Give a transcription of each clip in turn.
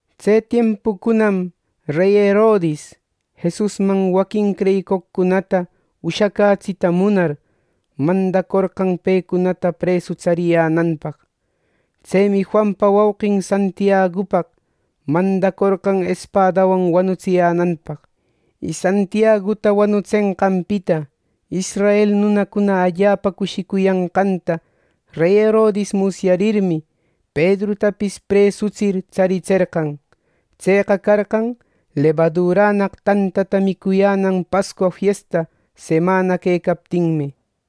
Tse tiempucunam rey Herodis, Jesusman waquin creyicoqcunata ushäcätsita munar, mandacorqan pecunata presu tsariyänanpaq. Tsemi Juanpa wauqin Santiagupaq mandacorqan espadawan wanutsiyänanpaq. Y Santiaguta wanutsenqanpita israel nunacuna allapa cushicuyanqanta rey Herodis musyarirmi, Pedrutapis presutsir tsaritserqan. Tseqa carqan lebadurannaq tantata micuyänan Pascua Fiesta semana quecaptinmi.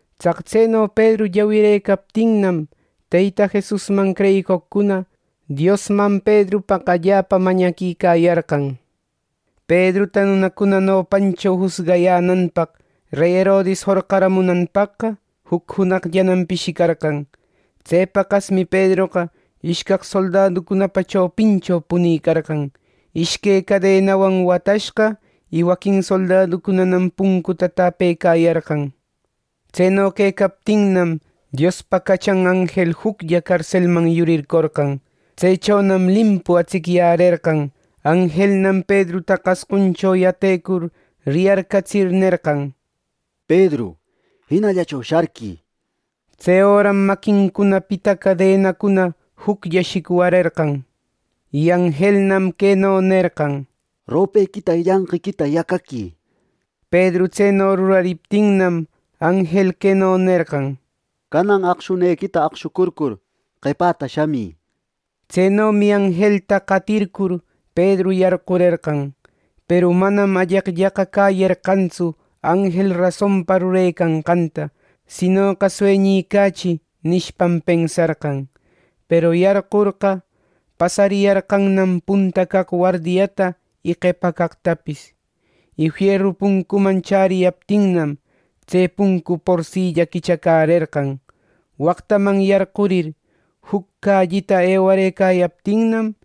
Tsaq tseno Pedru llawirëcaptinnam, Teyta Jesusman creyicoqcuna Diosman Pedrupaq allapa mañaquicayarqan. Pedruta nunacuna nopancho jusgayänanpaq rey Herodis jorqamunanpaqqa juc junaqllanam pishicarqan. Tse paqasmi Pedroqa ishcaq soldaducunapa chopincho punicarqan, ishque cadenawan watashqa. Y waquin soldaducunanam puncuta täpecayarqan. Tseno quecaptinnam, Diospa cachan anjel juclla carselman yurircorqan. Tsechonam limpu atsicyärerqan. Anjelnam Pedruta qasquncho yatecur riyarcatsir, “Pedru, jinallacho sharquï” nerqan. Tse öram maquincunapita cadenacuna juclla shicwarerqan. Y anjelnam queno nerqan: —Ropequita y llanqiquita yacaqui —nishpa. Pedru tseno rurariptinnam, anjel queno nerqan: —Canan aqshunequita aqshucurcur qepata shamï —nishpa. Tsenomi anjelta qatircur Pedru yarqurerqan. Peru manam alleqllaqa cäyerqantsu anjel rasonpa rurecanqanta; sinoqa “Sueñicächi” nishpam, pensarqan. Peru yarqurqa, pasariyarqannam punta caq wardiata y qepa caqtapis. Y fieru puncuman chäriyaptinnam, tse puncu porsilla quichacärerqan. Waqtaman yarqurir, juc callita ewarëcayaptinnam,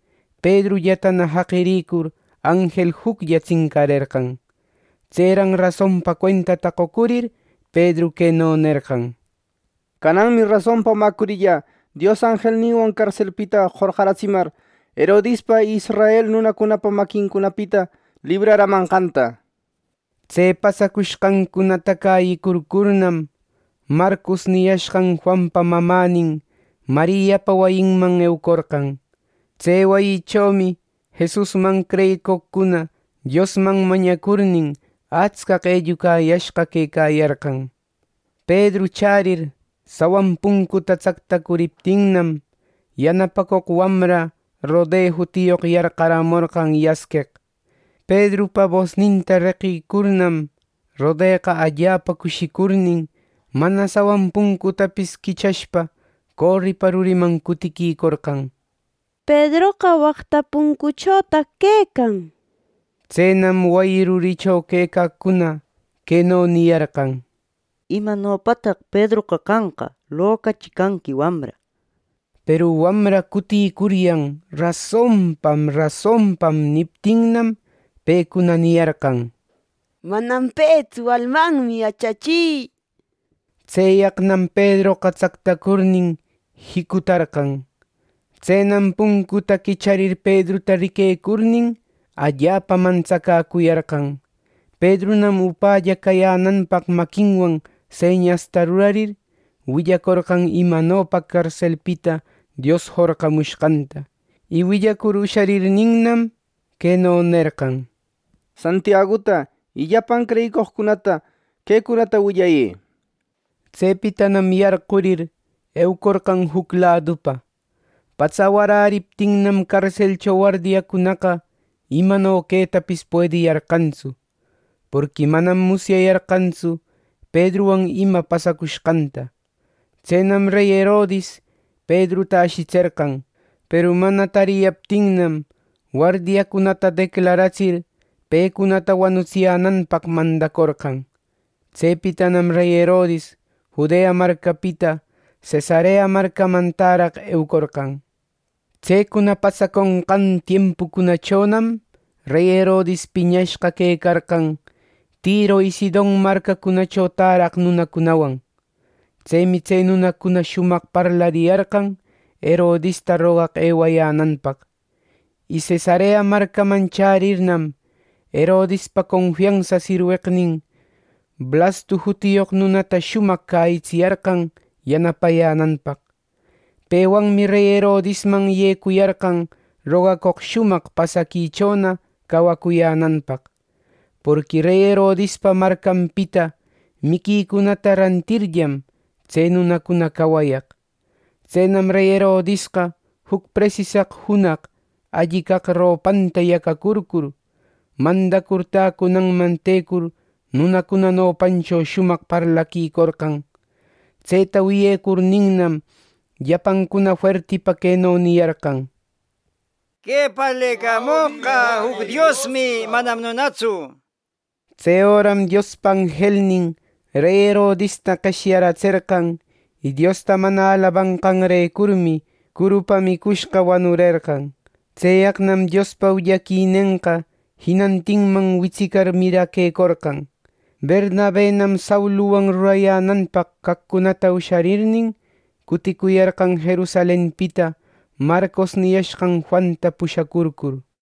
Pedrullatana jaqirïcur, anjel juclla tsincarerqan. Tseran rasonpa cuentata qocurir, Pedru queno nerqan: —Cananmi rasonpa mäcurillä Dios anjelninwan carselpita jorqatsimar, Herodispa y israel nunacunapa maquincunapita libraramanqanta. Tse pasacushqancunata cäyicurcurnam, Marcos niyashqan Juanpa mamänin Mariapa wayinman eucorqan. Tse wayichomi Jesusman creyicoqcuna Diosman mañacurnin, atscaq ellucayashqa quecayarqan. Pedru chärir, sawan puncuta tsactacuriptinnam, yanapacoq wamra Rode jutiyoq yarqaramorqan yasqueq. Pedrupa bosninta reqirïcurninnam, Rodeqa allapa cushicurnin mana sawan puncutapis quichashpa, coripa ruriman cutiquicorqan, “¡Pedroqa waqta puncuchotaq quecan!” nishpa. Tsenam wayi ruricho quecaqcuna queno niyarqan: —¿Imanopataq Pedroqa canqa! Locachi canqui, wamra —nishpa. Peru wamra cutïcuryan “rasonpam, rasonpam” niptinnam, pecuna niyarqan: —Manam petsu; almanmi —nishpa. Tseyaqnam Pedroqa tsactacurnin jicutarqan. Tsenam puncuta quicharir Pedruta riquecurnin, allapa mantsacäcuyarqan. Pedrunam upälla cayänanpaq maquinwan señasta rurarir, willacorqan imanopa carselpita Dios jorqamushqanta. Y willacur usharirninnam, queno nerqan: —Santiaguta y llapan creyicoqcunata quecunata willayë —nishpa. Tsepitanam yarqurir, eucorqan juc ladupa. Patsa waräriptinnam carselcho wardiacunaqa imano quetapis puediyarqantsu; porqui manam musyayarqantsu Pedruwan ima pasacushqanta. Tsenam rey Herodis Pedruta ashitserqan; peru mana tariyaptinnam, wardiacunata declaratsir pecunata wanutsiyänanpaq mandacorqan. Tsepitanam rey Herodis Judea marcapita Cesarea marcaman täraq eucorqan. Tsecuna pasaconqan tiempucunachonam rey Herodis piñashqa quecarqan Tiro y Sidon marcacunacho täraq nunacunawan. Tsemi tse nunacuna shumaq parlariyarqan Herodista rogaq ewayänanpaq. Y Cesarea marcaman chärirnam, Herodispa confiansa sirweqnin Blastu jutiyoq nunata shumaq cäyitsiyarqan yanapayänanpaq. Pewanmi rey Herodisman yecuyarqan rogacoq shumaq pasaquichona cacuyänanpaq; porqui rey Herodispa marcanpita miquicunata rantirllam, tse nunacuna cawayaq. Tsenam rey Herodisqa juc presisaq junaq alli caq ropanta yacacurcur, mandacur täcunanman tecur nunacuna nopancho shumaq parlaquicorqan. Tseta wiyecurninnam, llapancuna fuertipa queno niyarqan: —¡Que parlecamoqqa juc diosmi; manam nunatsu! —nishpa. Tse öram Diospa anjelnin rey Herodista qeshyaratserqan, Diosta mana alabanqanrecur; y curupa micushqam wanurerqan. Tseyaqnam Diospa willaquinenqa jinantinman witsicar, miraquecorqan. Bernabenam Sauluwan rurayänanpaq caqcunata usharirnin, cuticuyarqan Jerusalenpita Marcos niyashqan Juanta pusharcur.